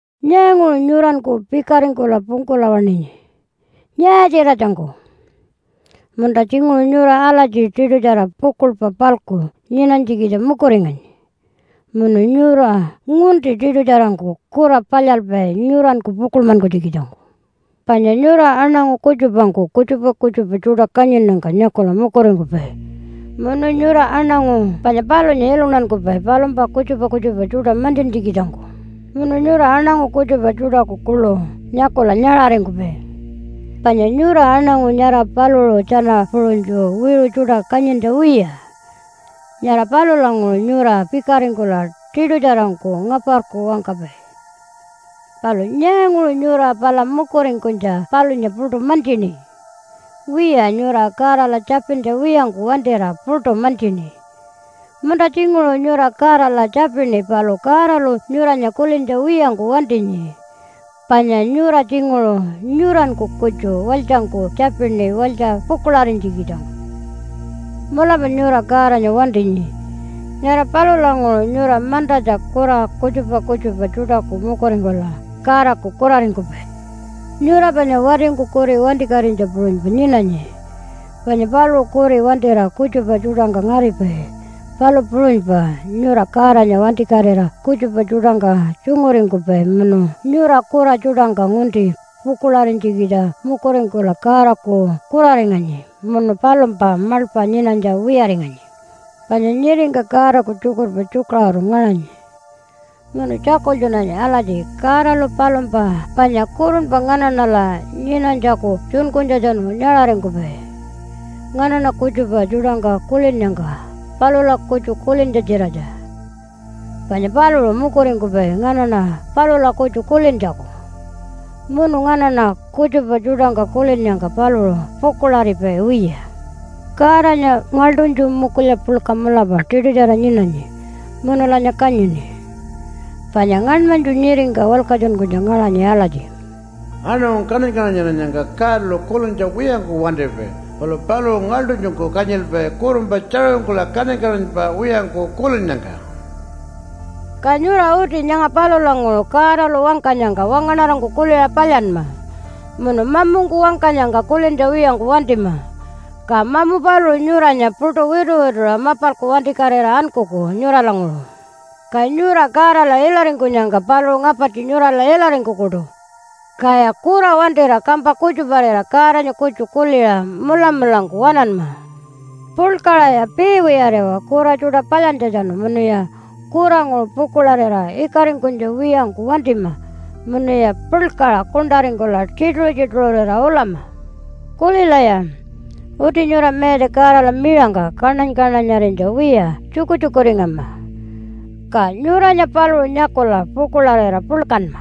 Nyaanguṟu nyuranku pikaringkula pungkula waṉinyi, nyaa-tjiratjangku? Munta tjinguṟu nyura alatji tiṯutjara pukuḻpa-palku nyinanytjikitja mukuringanyi munu nyura ngunti tiṯutjarangku kura palyalpai nyuranku pukuḻmankunytjikitjangku. Panya nyura aṉangu kutjupangku kutjupa kutjupa tjuṯa kanyinnyangka nyakula mukuringkupai munu nyura aṉangu panya palunya iluntankupai palumpa kutjupa kutjupa tjuṯa mantjintjikitjangku. Munu nyura aṉangu kutjupa tjuṯaku kuḻu nyakula nyaṟaringkupai panya nyura aṉangu nyara paluṟu tjana puṟunytju wiṟu tjuṯa kanyintja wiya. Nyara palulanguṟu nyura pikaringkula tiṯutjarangku ngaparku wangkapai. Palu nyaanguṟu nyura pala mukuringkunytja palunya puṯu mantjini? Wiya, nyura Godala tjapintja wiyangku wantira puṯu mantjini. Munta tjinguṟu nyura Godala tjapini, palu Godalu nyuranya kulintja wiyangku wantinyi, panya nyura tjinguṟu nyuranku kutju walytjangku tjapini walytja pukuḻarinytjikitjangku. Mulapa nyura Godanya wantinyi. Nyara palulanguṟu nyura mantatja kura kutjupa kutjupa tjuṯaku mukuringkula Godaku kuraringkupai. Nyura panya watingku kuri wantikatinytja puṟunypa nyinanyi, panya paluṟu kuri wantira kutjupa tjuṯangka ngaripai, palu puṟunypa nyura Godanya wantikatira kutjupa tjuṯangka tjunguringkupai. Munu nyura kura tjuṯangka ngunti pukuḻarinytjikitja mukuringkula Godaku kuraringanyi munu palumpa maḻpa nyinanytja wiyaringanyi. Panya nyiringka Godaku tjukurpa tjukaṟuru ngaṟanyi munu tjakultjunanyi alatji Godalu palumpa panya kurunpa nganaṉala nyinanytjaku tjunkunytjatjanu nyaṟaringkupai nganaṉa kutjupa tjuṯangka kulinnyangka palula kutju kulintja-tjiratja. Panya paluṟu mukuringkupai nganaṉa palula kutju kulintjaku. Munu nganaṉa kutjupa tjuṯangka kulinnyangka paluṟu pukuḻaripai wiya. Godanya ngaḻṯunytju mukulya puḻka mulapa tiṯutjara nyinanyi munulanya kanyini. Panya ngaṉmanytju nyiringka walkatjunkunytja ngaṟanyi alatji, “Aṉangu kaṉany-kaṉanyarinyangka Godalu kulintja wiyangku wantipai, palu paluṟu ngaḻṯunytjungku kanyilpai kurunpa tjaṟuringkula kaṉany-kaṉanypa wiyangku kulinnyangka.” Ka nyura uti nyanga palulanguṟu Godalu wangkanyangka wangaṉarangku kuliṟa palyanma. Munu mamungku wangkanyangka kulintja wiyangku wantima. Ka mamu paluṟu nyuranya puṯu wituwituṟa mapalku wantikatira ankuku nyuralanguṟu. Ka nyura Godala ilaringkunyangka paluṟu ngapartji nyurala ilaringkukuṯu. Kaya kura wantira kampa kutjaparira Godanya kutju kuliṟa mulamulangku waṉanma. Puḻkaṟaya piiwiyariwa kura tjuṯa palyantjatjanu munuya kuranguṟu pukuḻarira ikaringkunytja wiyangku wantima munuya puḻkaṟa kuṉṯaringkula tjituṟu-tjituṟurira ulama. Kulilaya, uti nyura Mayatja Godala miṟangka kaṉany-kaṉanyarinytja wiya tjukutjukuringama, ka nyuranya paluṟu nyakula pukuḻarira puḻkanma.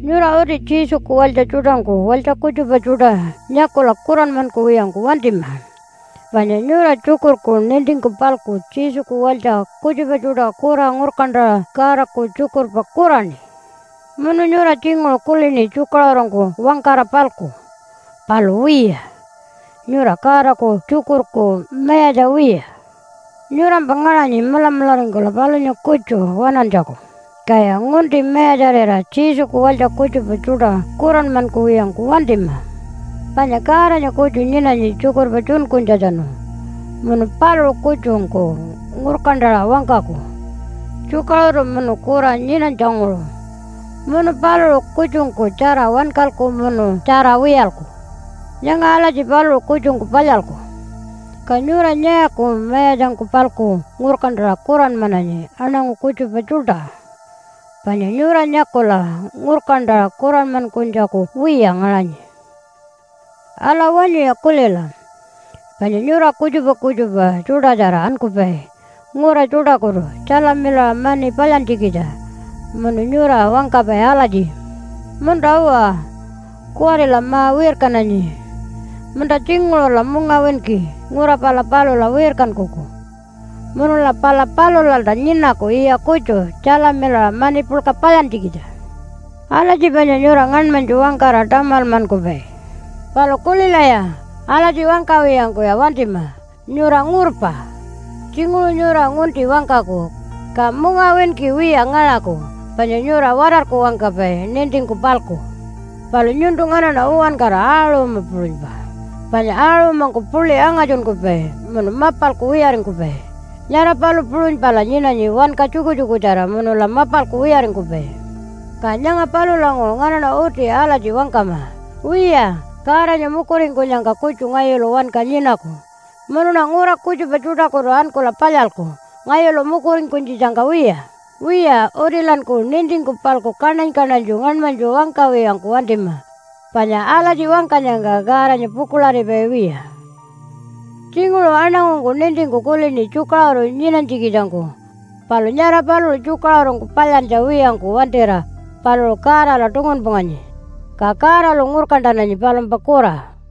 Nyura uti Jesuku walytja tjuṯangku walytja kutjupa tjuṯa nyakula kuranmankuwiyangku wantima. Panya nyura tjukurku nintingku-palku Jesuku walytja kutjupa tjuṯa kura ngurkantaṟa Godaku tjukurpa kuraṉi. Munu nyura tjinguṟu kulini tjukaṟurungku wangkara-palku. Palu wiya, nyura Godaku tjukurku mayatja wiya. Nyurampa ngaṟanyi mulamularingkula palunya kutju waṉantjaku, kaya ngunti mayatjarira Jesuku walytja kutjupa tjuṯa kuranmankuwiyangku wantima. Panya Godanya kutju nyinanyi tjukurpa tjunkunytjatjanu, munu paluṟu kutjungku ngurkantaṟa wangkaku tjukaṟuru munu kura nyinanytjanguṟu. Munu paluṟu kutjungku tjara wankalku, munu tjara wiyalku. Nyanga alatji paluṟu kutjungku palyalku. Ka nyura nyaaku mayatjangku-palku ngurkantaṟa kuranmananyi aṉangu kutjupa tjuṯa, panya nyura nyakula ngurkantaṟa kuranmankunytjaku wiya ngaṟanyi. Ala, wanyuya kulila, panya nyura kutjupa kutjupa tjuṯatjara ankupai ngura tjuṯakutu tjalamilaṟa mani palyantjikitja. Munu nyura wangkapai alatji, “Munta-uwa, kuwarila ma-wirkananyi munta tjinguṟula mungawinki ngura pala palula wirkankuku. Munula pala palulalta nyinaku yiya kutju tjalamilaṟa mani puḻka palyantjikitja.” Alatji panya nyura ngaṉmanytju wangkara tamalmankupai. Palu kulilaya, alatji wangkawiyangkuya wantima. Nyura ngurpa. Tjinguṟu nyura ngunti wangkaku, ka mungawinki wiya ngaṟaku, panya nyura watarku wangkapai nintingku-palku. Palu nyuntu nganaṉa uwankara aṟuma puṟunypa, panya aṟumangku puḻi angatjunkupai munu mapalku wiyaringkupai, nyara palu puṟunypala nyinanyi wanka tjukutjukutjara munula mapalku wiyaringkupai. Ka nyanga palulanguṟu nganaṉa uti alatji wangkama, “Wiya, Godanya mukuringkunyangka kutju ngayulu wanka nyinaku munuṉa ngura kutjupa tjuṯakutu ankula palyalku, ngayulu mukuringkunytjitjangka wiya.” Wiya, utilanku nintingku-palku kaṉany-kaṉanytju ngaṉmanytju wangkawiyangku wantima, panya alatji wangkanyangka Godanya pukuḻaripai wiya. Tjinguṟu aṉangungku nintingku kulini tjukaṟuru nyinanytjikitjangku, palu nyara paluṟu tjukaṟurungku palyantja wiyangku wantira paluṟu Godala tungunpunganyi, ka Godalu ngurkantananyi palumpa kura.